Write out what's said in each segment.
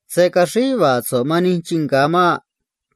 Se̱ caxríj yuva̱a̱ so̱ꞌ man nij chii nga̱ maꞌ.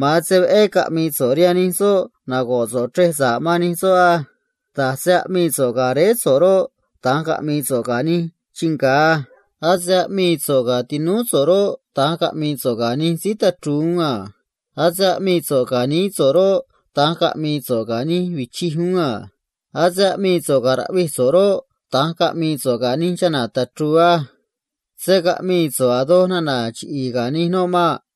Tana̱nj veꞌé caꞌmi̱i̱ so̱ꞌ rihaan nij soꞌ narque̱ so̱ꞌ chrej sa̱ꞌ man nij soꞌ á. Da̱j se aꞌmii so̱ꞌ ga̱ réé so̱ꞌ roꞌ, da̱nj caꞌmi̱i̱ so̱ꞌ ga̱ nij chii nga̱ á. Ase aꞌmii so̱ꞌ ga̱ tinúú so̱ꞌ roꞌ, da̱nj caꞌmi̱i̱ so̱ꞌ ga̱ nij síí tachru̱u̱ uún a. Ase aꞌmii so̱ꞌ ga̱ nií so̱ꞌ roꞌ, da̱nj caꞌmi̱i̱ so̱ꞌ ga̱ nij vichij uún a. Ase aꞌmii so̱ꞌ ga̱ raꞌvij so̱ꞌ roꞌ, da̱nj caꞌmi̱i̱ so̱ꞌ ga̱ nij chana̱ tachru̱u̱ á. Se̱ caꞌmii so̱ꞌ a̱ doj nana̱ chiꞌi̱i̱ ga̱ nij noꞌ maꞌ.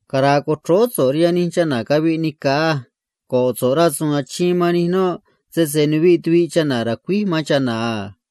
Cara̱a̱ co̱chróó so̱ꞌ man nij chana̱ caviꞌ nica̱ á. Rque̱ so̱ꞌ rasu̱u̱n achiin man nij noꞌ, sese nuviꞌ tuviꞌ chana̱ racuíj man chana̱ a.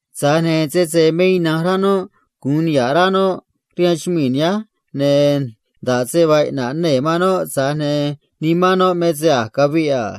Tza̱j ne̱ sese me ina̱nj rá noꞌ gu̱un niha̱ꞌ rá noꞌ rihaan chumii̱ nihánj, ne̱ nda̱ꞌ se vaa iꞌna̱ꞌ nee̱ man noꞌ, tza̱j ne̱ nimán noꞌ me se a̱j caviꞌ a.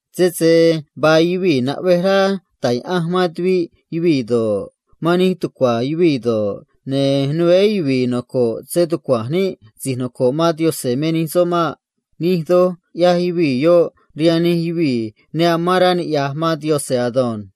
Sese vaa yuvii̱ ne taj yaꞌanj man tuviꞌ yuvii̱ do̱ꞌ, man nij tucua̱ yuvii̱ do̱ꞌ, ne̱ né yuvi̱i̱ noco̱ꞌ stucua̱nj níꞌ si̱j noco̱ꞌ man Yaꞌanj me nij soꞌ maꞌ. Nij doj ꞌyaj yuvii̱ yoꞌ rihaan nij yuvii̱ ne nocoꞌ man Yaꞌanj ado̱nj.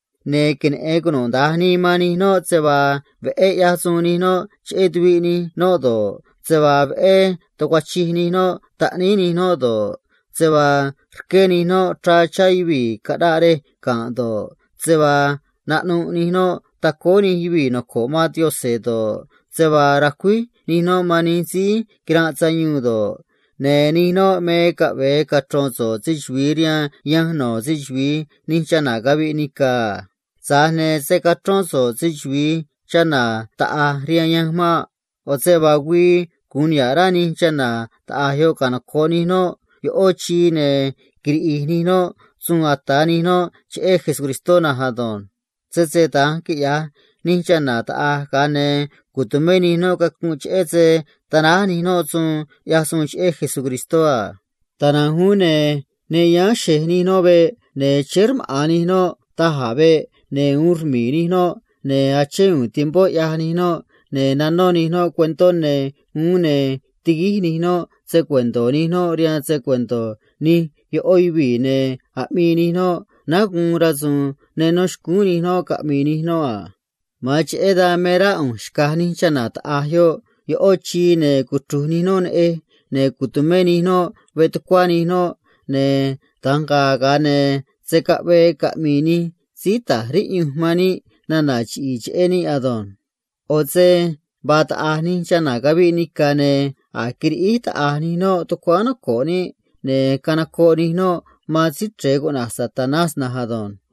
Ne̱ queneꞌe̱n cunuda̱nj nii man nij noꞌ se vaa veꞌé ꞌyaj nij noꞌ suun sa̱ꞌ cheꞌé tuviꞌ nij noꞌ do̱ꞌ, se vaa veꞌé tucuachij nij noꞌ taꞌníí nij noꞌ do̱ꞌ, se vaa rqué nij noꞌ se chá chá yuvii̱ aranꞌ tucuá nij noꞌ do̱ꞌ, se vaa naꞌnuꞌ nij noꞌ tacóó nij síí noco̱ꞌ man Cristó do̱ꞌ, se vaa racuíj nij noꞌ man nij síí quiranꞌ sayuun do̱ꞌ, ne̱ nij noꞌ me caꞌve̱e cachro̱n so̱ꞌ se‑chuvi̱i rihaan yanj no̱ se‑chuvi̱i nij chana̱ caviꞌ nica̱ a. Tza̱j ne̱ se̱ cachrón so̱ꞌ se‑chuvi̱i chana̱ taꞌa̱j rihaan yanj maꞌ. ꞌO̱ se vaa güii gu̱un niha̱ꞌ rá nij chana̱ taꞌa̱j yoꞌ canoco̱ꞌ nij noꞌ ꞌó snóꞌo, ne̱ quiriꞌi̱j nij noꞌ suun ata̱ nij noꞌ cheꞌé Cristó na̱nj ado̱nj. Sese da̱nj quiꞌya̱j nij chana̱ taꞌa̱j, ga̱a ne̱ tu̱mé nij noꞌ cacunꞌ cheꞌé se tanáj nij noꞌ nana̱ cataꞌ tuꞌva nij noꞌ rihaan Cristó a. Da̱nj na̱nj uún, ne̱ ne yáán xe̱j nij noꞌ veꞌ, ne̱ chéé rmaꞌa̱n nij noꞌ da̱j a̱ veꞌ, ne̱ uun rmi̱i̱ nij noꞌ, ne̱ achén u̱u̱n tiempó, ꞌyaj nij noꞌ, ne̱ nanó nij noꞌ cuentó ne̱ uún, ne̱ tiguíj nij noꞌ se‑cuento̱ nij noꞌ rihaan se‑cuento̱ ꞌó nij yuvii̱, ne̱ aꞌmii nij noꞌ náá guun rasu̱u̱n ne nó xcúún nij noꞌ caꞌmi̱i̱ nij noꞌ a. Ma̱an cheꞌé dan me rá ꞌu̱nj xca̱j nij chana̱ taꞌa̱j yoꞌ ꞌó snóꞌo, ne̱ cuchru̱j nij noꞌ neꞌej, ne̱ tu̱mé nij noꞌ veꞌ tucuá nij noꞌ, ne̱ da̱nj ga̱a̱, ga̱a ne̱ se̱ caꞌvee caꞌmi̱i̱ nij síí ta̱j riꞌyunj man níꞌ nana̱ chiꞌi̱i̱ cheꞌé níꞌ maꞌ. ꞌO̱ se vaa taꞌa̱j nij chana̱ caviꞌ nica̱, ne̱ a̱j quiriꞌíj taꞌa̱j nij noꞌ tucuáán noco̱ꞌ níꞌ, ne̱ canocoꞌ nij noꞌ man Síí Chre̱e na̱nj ado̱nj.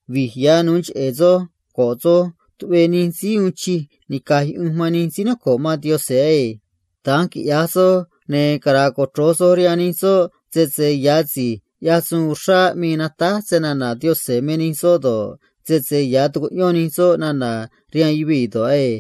Vi̱j ya̱ na̱nj go̱ꞌ soj tuꞌvee nij síí tumé sa̱ꞌ rihaan Yaꞌanj man nij síí noco̱ꞌ man Cristó á. Da̱nj quiꞌya̱j soj, ne̱ cara̱a̱ cochro̱j soj rihaan nij soꞌ sese ya̱ si̱j aꞌmii natáj snana̱ Yaꞌanj me nij soꞌ do̱ꞌ, sese ya̱ tucuꞌyón nij soꞌ nana̱ rihaan yuvii̱ do̱ꞌ á.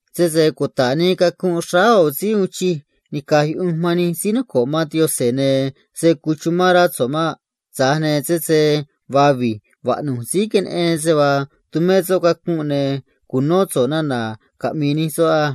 Sese cuta̱ꞌ nii cacunꞌ xráá ꞌo̱ síí tumé sa̱ꞌ rihaan Yaꞌanj man nij síí noco̱ꞌ man Cristó, ne̱ se̱ cuchumán rá so̱ꞌ maꞌ. Tza̱j ne̱ sese vaa vi̱j vaꞌnu̱j síí queneꞌen se vaa tumé soꞌ cacunꞌ, ne̱ cu̱nó so̱ꞌ nana̱ caꞌmi̱i̱ nij soꞌ á.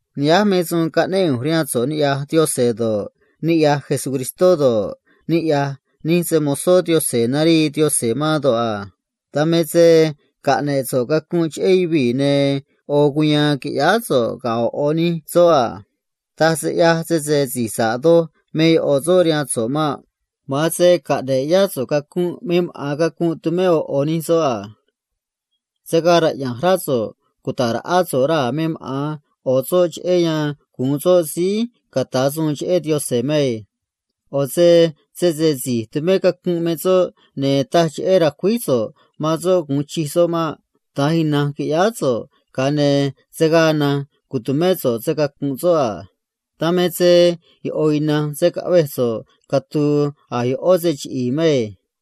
Nihánj me suun caꞌnéꞌ ꞌu̱nj rihaan so̱ꞌ niꞌya̱j Yaꞌanj do̱ꞌ, niꞌya̱j Cristó Jesús do̱ꞌ, niꞌya̱j nij se‑mo̱zó Yaꞌanj narii Yaꞌanj man do̱ꞌ a. Ga̱a caꞌne̱ꞌ so̱ꞌ cacunꞌ cheꞌé yuvii̱, ne̱ ꞌo̱ cuya̱a̱n qui̱ꞌyáá so̱ꞌ ga̱ ꞌo̱ ꞌo̱ nij soꞌ a. Taj se ꞌyaj sese si̱j sa̱ꞌ doj me ꞌo̱ soꞌ rihaan so̱ꞌ maꞌ. Ma̱an se caꞌne̱ꞌ yá so̱ꞌ cacunꞌ me maꞌa̱n cacunꞌ tumé ꞌo̱ ꞌo̱ soꞌ a. Se̱ gaa raꞌya̱nj rá so̱ꞌ cuta̱ꞌ raꞌá so̱ꞌ raa̱ me maꞌa̱n ꞌo̱ soꞌ cheꞌé yan gu̱un soꞌ síí ca̱ta̱ suun cheꞌé Yaꞌanj maꞌ. ꞌO̱ se sese si̱j tumé cacunꞌ me soꞌ, ne̱ taj cheꞌé ra̱cuíj so̱ꞌ man soꞌ gu̱un chij soꞌ maꞌ. Da̱nj ina̱nj qui̱ꞌyáá so̱ꞌ, ga̱a ne̱ se̱ gaa na̱nj tu̱mé so̱ꞌ se‑cacu̱nꞌ soꞌ a. Dan me se ꞌo̱ ina̱nj se̱ caꞌvej so̱ꞌ catu̱u̱ a̱ ꞌó se chiꞌi̱i̱ maꞌ.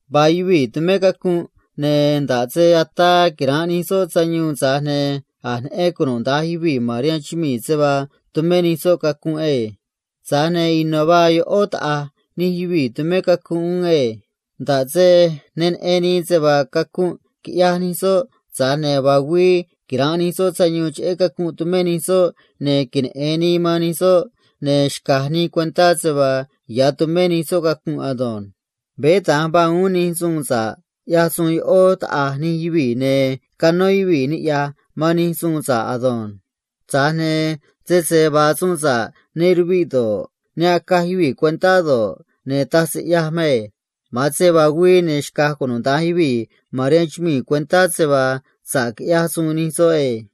Vaa yuvii̱ tumé cacunꞌ, ne̱ nda̱ꞌ se ataa quira̱nꞌ nij soꞌ sayuun, tza̱j ne̱ a̱j neꞌen cunuda̱nj yuvii̱ se vaa tumé nij soꞌ cacunꞌ ado̱nj. Tza̱j ne̱ ino̱ vaa ꞌó taꞌa̱j nij yuvii̱ tumé cacunꞌ uún na̱nj á. Nda̱ꞌ se ne neꞌen nii se vaa quiꞌyaj nij soꞌ cacunꞌ, tza̱j ne̱ vaa güii quira̱nꞌ nij soꞌ sayuun cheꞌé cacunꞌ tumé nij soꞌ, ne̱ queneꞌe̱n nii man nij soꞌ, ne̱ xca̱j nii cuentá se vaa ya̱ tumé nij soꞌ cacunꞌ ado̱nj. Veé da̱nj vaa uún nij suun sa̱ꞌ ꞌyaj ꞌó taꞌa̱j nij yuvii̱, ne̱ canó yuvii̱ niꞌya̱j man nij suun sa̱ꞌ ado̱nj. Tza̱j ne̱ sese vaa suun sa̱ꞌ ne ruviꞌ do̱ꞌ, ne acaj yuvii̱ cuentá do̱ꞌ, ne̱ taj se ꞌyaj maꞌ. Ma̱an se vaa güii, ne̱ xca̱j cunuda̱nj yuvii̱ cuentá se vaa sa̱ꞌ quiꞌyaj nij soꞌ ado̱nj.